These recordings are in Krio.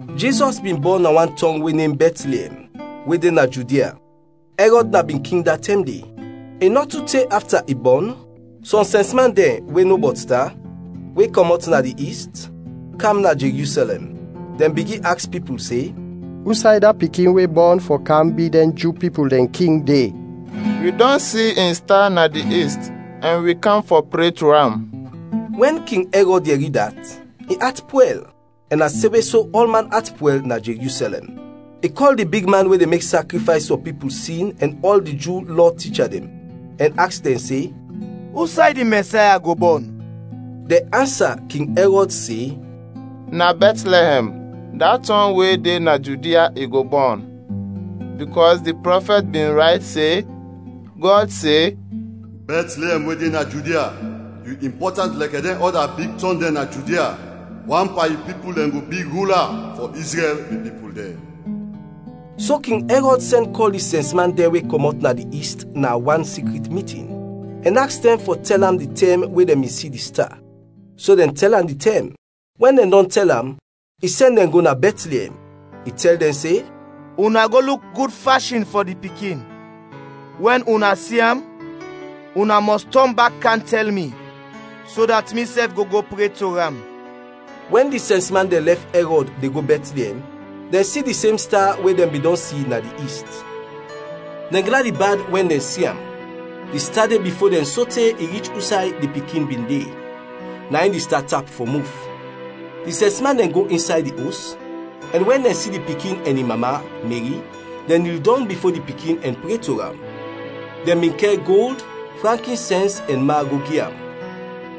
Jizɔs bin bɔn na wan tɔng we nem Bɛtliɛm we de na Judia. Ɛrɔd na bin king da tɛm de. I nɔ tu te afta i bɔn, sɔm sɛnsman dɛn we no bɔt sta, we kɔmɔt na di ist, kam na Jerusɛlɛm. Dɛn bigin aks pipul se, “Usay da pikin we bɔn fɔ kam bi dɛn Ju pipul dɛn king, de? Wi dɔn si in sta na di ist ɛn wi kam fɔ pre to am.” Wɛn King Ɛrɔd yɛri dat, in at pwɛl, ɛn na semwe so ɔlman at pwɛl na Jerusɛlɛm. I kɔl di bigman we de mek sakrifays fɔ pipul sin ɛn ɔl di Ju Lɔ ticha dɛn, ɛn aks dɛn se, “Usay di Mɛsaya go bɔn?” Dɛn ansa King Ɛrɔd se, “Na Bɛtliɛm, da tɔng we de na Judia, i go bɔn. Bikɔs di prɔfɛt bin rayt se, Gɔd se, ‘Bɛtliɛm we de na Judia, yu impɔtant lɛkɛ dɛn ɔda big tɔng dɛn na Judia; wan pan yu pipul dɛn go bi rula fɔ Izrɛl, mi pipul dɛn.’” So King Ɛrɔd sɛn kɔl di sɛnsman dɛn we kɔmɔt na di ist na wan sikrit mitin, ɛn aks dɛn fɔ tɛl am di tɛm we dɛn bin si di sta. So dɛn tɛl am di tɛm. Wɛn dɛn dɔn tɛl am, i sɛn dɛn go na Bɛtliɛm, i tɛl dɛn se, “Una go luk gud fashin fɔ di pikin; wɛn una si am una mɔs tɔn bak kam tɛl mi, so dat misɛf go go pre to am.” Wɛn di sɛnsman dɛn lɛf Ɛrɔd de go Bɛtliɛm, dɛn si di sem sta we dɛn bin dɔn si na di ist. Dɛn gladi bad wɛn dɛn si am! Di sta de bifo dɛn sote i rich usay di pikin bin de, na in di sta tap fɔ muf. Di sɛnsman dɛn go insay di os, ɛn wɛn dɛn si di pikin ɛn in mama, Meri, dɛn nil dɔng bifo di pikin ɛn pre to am. Dɛn bin kɛr gold, frankinsɛns ɛn ma go gi am.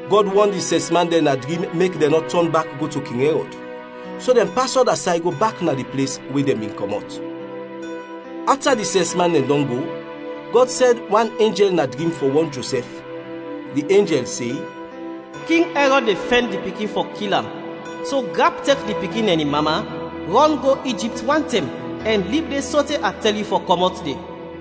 Gɔd wɔn di sɛnsman dɛn na drim mek dɛn nɔ tɔn bak go to King Ɛrɔd, so dɛn pas ɔda say go bak na di ples we dɛn bin kɔmɔt. Afta di sɛnsman dɛn dɔn go, Gɔd sɛn wan enjɛl na drim fɔ wɔn Josɛf. Di enjɛl se, “King Ɛrɔd de fɛn di pikin fɔ kil am, so grap tek di pikin ɛn in mama, rɔn go Ijipt wantɛm, ɛn lib de sote a tɛl yu fɔ kɔmɔt de.”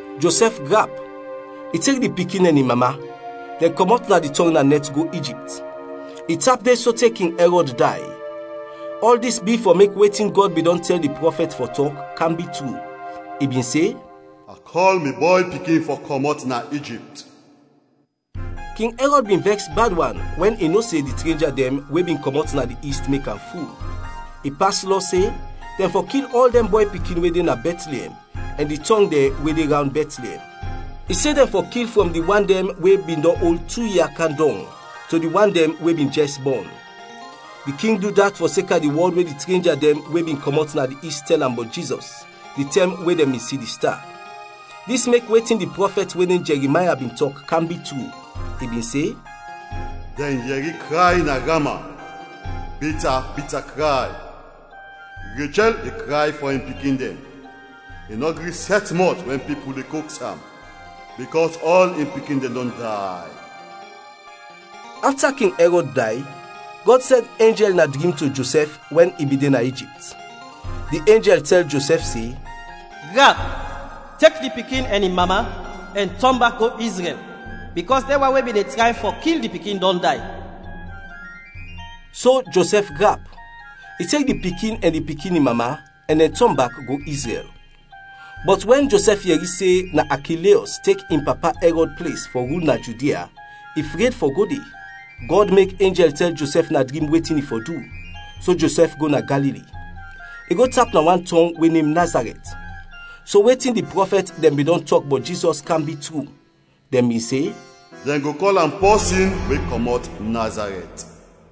Josɛf grap, i tek di pikin ɛn in mama; dɛn kɔmɔt na di tɔng na nɛt go Ijipt. I tap de sote King Ɛrɔd day. Ɔl dis bi fɔ mek wetin Gɔd bin dɔn tɛl di prɔfɛt fɔ tɔk, kam bi tru. I bin se, “A kɔl mi Bɔy Pikin fɔ kɔmɔt na Ijipt.” King Ɛrɔd bin vɛks bad wan wɛn i no se di trenja dɛn we bin kɔmɔt na di ist mek am ful. I pas lɔ se, dɛn fɔ kil ɔl dɛn bɔy pikin we de na Bɛtliɛm ɛn di tɔng dɛn we de rawnd Bɛtliɛm. I se dɛn fɔ kil frɔm di wan dɛn we bin dɔn ol tu ia kam dɔng to di wan dɛn we bin jɛs bɔn. Di king du dat fɔseka di wɔd we di trenja dɛn we bin kɔmɔt na di ist tɛl am bɔt Jizɔs, di tɛm we dɛn bin si di sta. Dis mek wetin di prɔfɛt we nem Jɛrimaya bin tɔk kam bi tru. I bin se, “Dɛn yɛri kray na Rama, bita bita kray. Rechɛl de kray fɔ in pikin dɛn; i nɔ gri sɛt mɔt wɛn pipul de koks am, bikɔs ɔl in pikin dɛn dɔn day.” Afta King Ɛrɔd day, Gɔd sɛn enjɛl na drim to Josɛf wɛn i bin de na Ijipt. Di enjɛl tɛl Josɛf se, “Grap, tek di pikin ɛn in mama, ɛn tɔn bak go Izrɛl, bikɔs dɛn wan we bin de tray fɔ kil di pikin dɔn day.” So Josɛf grap, i tek di pikin ɛn di pikin in mama, ɛn dɛn tɔn bak go Izrɛl. Bɔt wɛn Josɛf yɛri se na Akileɔs tek in papa Ɛrɔd ples fɔ rul na Judia, i fred fɔ go de. Gɔd mek enjɛl tɛl Josɛf na drim wetin i fɔ du, so Josɛf go na Galili, i go tap na wan tɔng we nem Nazarɛt. So wetin di prɔfɛt dɛn bin dɔn tɔk bɔt Jizɔs kam bi tru. Dɛn bin se, “Dɛn go kɔl am pɔsin we kɔmɔt Nazarɛt.”